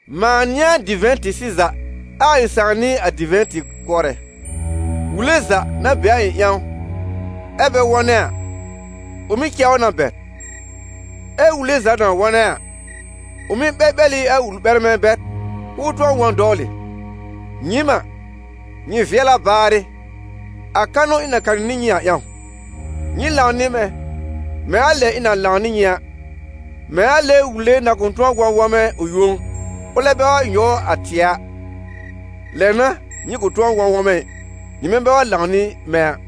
«Mãa n'ɩ a divɛ̃-tɩ-sɩza ɛ a ɩ̃ Sãà n'ɩ a divɛ̃-tɩ-kʋɔrɛ. Wùle za, na be a ɩ̃ ƴãw, ɛ bɛ wɔ̃nɛ a, ʋ mɩ́ cɛ ʋ na bɛr, ɛ wùle za na wɔ̃nɛ a, ʋ mɩ́ ɓɛlɓɛl ɩ a wuli-ɓɛrmɛ bɛr k'ʋʋ tʋ̃ɔ wɔ̃ dɔwlɩ. Nyɩɩm a, nyɩ vɩɛl a baarɩ, a kanʋ ɩ̃ na kanɩ nɩ nyɩ a ƴãw. Nyɩ lãw nɩ mɛ̃, mɛ̃ a lɛ ɩ̃ na lãw nɩ nyɩ a. Mɛ̃ a lɛ wùle na kʋ̃ tʋ̃ɔ wɔ̃ wɔ̃mɛ ʋ yõ, ʋlɛ bɛ wa nyɔw a tɩɛ a, lɛ n'a nyɩ kʋ̃ wɔ̃ wɔ̃mɛ ɩ, nyɩmɛ bɛ wa lãw nɩ mɛ̃ a.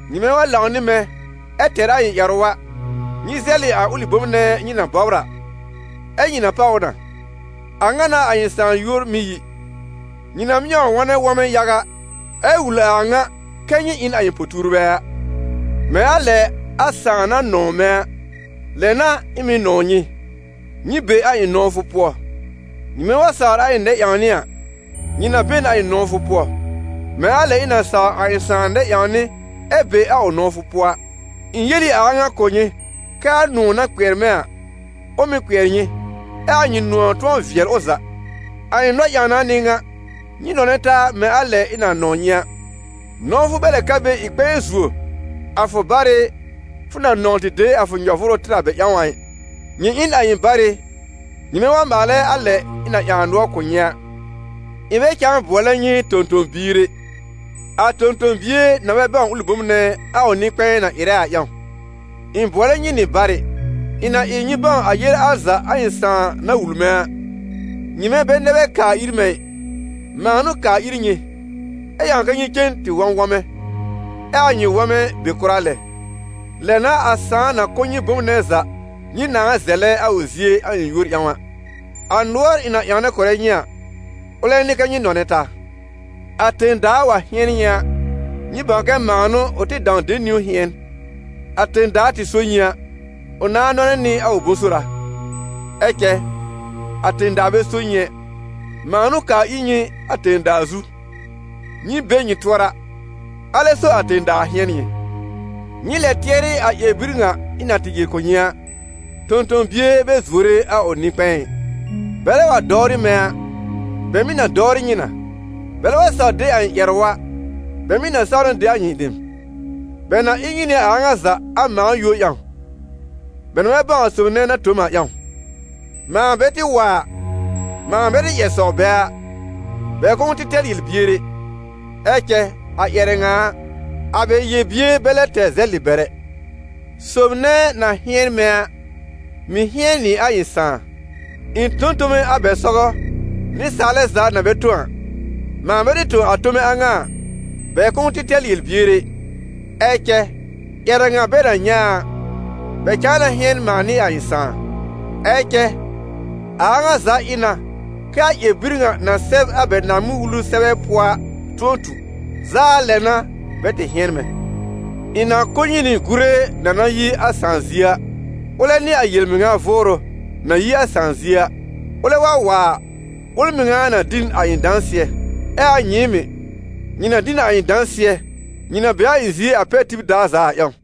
Nyɩmɛ wa lãw nɩ mɛ̃ ɛ tɛr a ɩ̃ ƴɛrʋ a, nyɩ zɛlɩ a ʋlɩ bom nɛ nyɩ na bɔbr a, ɛ́ nyɩ na páw ʋ na. A ŋa n'a a ɩ̃ Sãà yúor mɩ́ yi, nyɩ na mɩ́ wa wɔnɛ wɔ̃mɛ yaga, ɛ wul a a ŋa kɛ nyɩ ɩ n a ɩ̃ po-tuurbɛ a. Mɛ̃ a lɛ a Sãà na nɔ̃w mɛ̃ a, lɛ n'a ɩ̃ mɩ̀ nɔw nyɩ. Nyɩ be a ɩ̃ nɔ̃wfʋ pʋɔ. Nyɩmɛ wa sawr a ɩ̃ nɛ-ƴãwnɩ a, nyɩ na be n a ɩ̃ nɔ̃wfʋ pʋɔ, mɛ̃ a lɛ ɩ̃ na saw a ɩ̃ Sãà nɛ-ƴãwnɩ ɛ be a ʋ nɔ̃wfʋ pʋɔ a.» «Ɩ̃ yel ɩ a a ŋa kʋ̀ nyɩ kɛ a nʋ̃ɔ̀ na kpɩɛr mɛ̃ a, ʋ mɩ́ kpɩɛr nyɩ, ɛ a nyɩ nʋ̃ɔ̀ tʋ̃ɔ vɩɛl ʋ za. A ɩ̃ nɔ-ƴãwna n'ɩ ŋa: nyɩ nɔnɛ taa mɛ̃ a lɛ ɩ̃ na nɔ̃w nyɩ a. Nɔ̃wfʋ bɛ lɛ ka be ɩ kpɛ̃ɛ zuo a fʋ barɩ fʋ na nɔ̃w tɩ de a fʋ nyɔ-vʋʋrʋ tɩr a bɛ ƴãw a ɩ. Nyɩ ɩ n a ɩ̃ barɩ nyɩmɛ wa maalɛ a lɛ ɩ̃ na ƴãw a nʋɔr kʋ̀ nyɩ a. Ɩ̃ bɛ cãa bʋɔlɛ nyɩ tõ-tõ-biir ɛ, a tõ-tõ-bie na bɛ bãw ʋlɩ bom nɛ a ʋ nɩ-kpɛ̃ɛ na ɩrɛ a ƴãw. Ɩ̃ bʋɔlɛ nyɩ nɩ barɩ, ɩ̃ na ɩ nyɩ bãw a yele al za a ɩ̃ Sãà na wul mɛ̃ a. Nyɩmɛ bɛ nɛ bɛ kaa ir mɛ̃ ɩ, mãa n'ʋ kaa ir nyɩ, ɛ ƴãw kɛ nyɩ cen tɩ wɔ̃ wɔ̃mɛ, ɛ a nyɩ wɔ̃mɛ be kʋra lɛ. Lɛ n'a a Sãà na kʋ̀ nyɩ bom nɛ za nyɩ nãá zɛlɛ a ʋ zie a ɩ̃ yúor ƴãw a. A nʋɔr ɩ̃ na ƴãwnɛ kʋ̀rɛ nyɩ a, ʋlɛ n'ɩ kɛ́ nyɩ nɔnɛ taa.» «A tẽ-daa wa hɩ̃ɛn nyɩ a, nyɩ bãw kɛ mãa n'ʋ ʋ tɩ dãw de niwn hɩ̃ɛn. A tẽ-daa tɩ so nyɩ a, ʋ nãá nɔnɛ nɩ a ʋ bʋ̃-sora; ɛ cɛ a tẽ-daa bɛ so nyɩ ɛ; mãa n'ʋ kaa ir nyɩ a tẽ-daa zu, nyɩ be nyɩ tʋɔra, alɛ so a tẽ-daa hɩ̃ɛn nyɩ. Nyɩ lɛ tɩɛrɩ a ƴɛr-bir ŋa ɩ̃ na tɩ yel kʋ̀ nyɩ a: ‹Tõ-tõ-bie bɛ zuore a ʋ nɩ-kpɛ̃ɛ ɩ.› Bɛlɛ wa dɔwrɩ mɛ̃ a, bɛ mɩ̀ na dɔwrɩ nyɩ na; bɛlɛ wa saw de a ɩ̃ ƴɛrʋ a, bɛ mɩ̀ na saw na de a nyɩ dem. Bɛ na ɩ nyɩ nɩ a a ŋa za a mãa yúor ƴãw, bɛ na bɛ bãw a sob nɛ na tõ m a ƴãw. Mãa bɛ tɩ wa a, mãa bɛ tɩ ƴɛr sɔw bɛ a, bɛ kʋ̃ʋ tɩ tɛr yel-bier ɛ, ɛ cɛ a ƴɛrɛ ŋa a, a bɛ yel-bier bɛ lɛ tɛr zɛlɩ bɛr ɛ. Sob nɛ na hɩ̃ɛn mɛ̃ a, mɩ̀ hɩ̃ɛn nɩ a ɩ̃ Sãà. Ɩ̃ tõ n tome a bɛ sɔgɔ nɩsaalɛ za na bɛ tõ a. Mãa bɛ tɩ tõ a tome a ŋa a, bɛ kʋ̃ʋ tɩ tɛr yel-bier ɛ, ɛ cɛ ƴɛrɛ ŋa bɛ na nyɛ̃ a a, bɛ cãa na hɩ̃ɛn mãa nɩ a ɩ̃ Sãà. Ɛ cɛ a a ŋa za ɩ na kɛ a ƴɛr-bir ŋa na sɛb a bɛ Naaŋmɩn-Wulu sɛbɛ pʋɔ a tʋ̃ɔ tu: ‹Zaa lɛ n'a bɛ tɩ hɩ̃ɛn mɛ̃.› Ɩ̃ na kʋ̀ nyɩ nɩ Gure na na yi a Sãà zie a. Ʋlɛ n'ɩ a yel-mɩŋa Vʋʋrʋ na yi a Sãà zie a; ʋlɛ wa wa a, ʋl mɩŋa na dɩ n a ɩ̃ dãsɩɛ. Ɛ a nyɩɩm mɩ̀, nyɩ na dɩ n a ɩ̃ dãsɩɛ, nyɩ na be a ɩ̃ zie a pɛr tib daar za a ƴãw.»